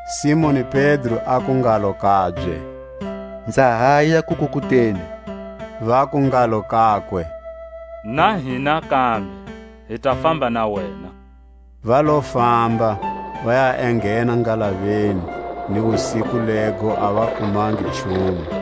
Simoni Pedro aku ngalo kabye: Nza haya kukukuteni. Vaku ngalo kakwe: Na hina kambe hi ta famba na wena. Va lo famba, va ya enghena ngalaveni; ni wusiku lego a va kumangi nchumu.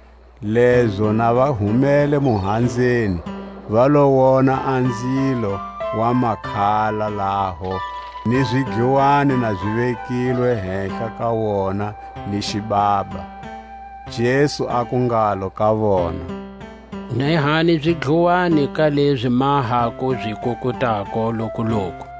Lezo na va humele muhanzeni va lo wona a nzilo wa makhala laho, ni zidluwani na zi vekilwe hehla ka wona, ni xibaba. Jesu aku ngalo ka vona: Nehani zidluwani ka lezi ma ha ku zi kukutako lokuloku.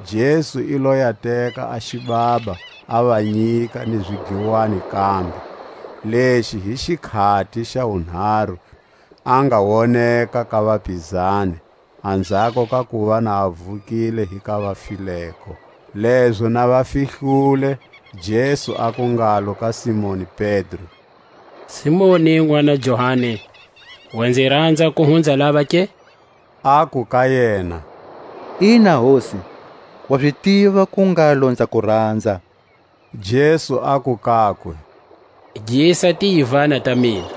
Jesu i lo ya teka a xibaba, a va nyika, ni zidluwani kambe. Lexi hi xikhati xa wunharu a nga woneka ka vapizani, anzhako ka kuva na a vukile hi ka vafileko. Lezo na va fihlule, Jesu aku ngalo ka Simoni Pedro: Simoni, nʼwana Johani, wa nzi ranza ku hunza lava ke? Aku ka yena: Ina, Hosi; wa zi tiva ku ngalo nza ku ranza. Jesu aku kakwe: Gisa tiyivana ta mina.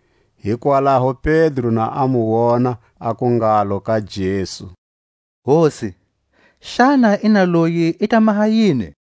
Hikwalaho Pedro na a mu wona, aku ngalo ka Jesu: Hosi, xana inaloyi i ta maha yini?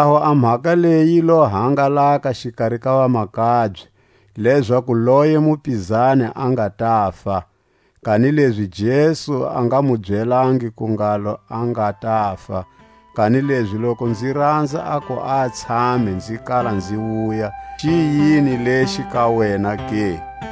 Hikwalaho a mhaka leyi yi lo hangalaka xikari ka vamakabye, lezaku loye mupizani a nga tafa; kanilezi Jesu a nga mu byelangi ku ngalo a nga tafa; kanilezi, Loku nzi ranza aku a tshame nzi kala nzi wuya, xi yini lexi ka wena ke?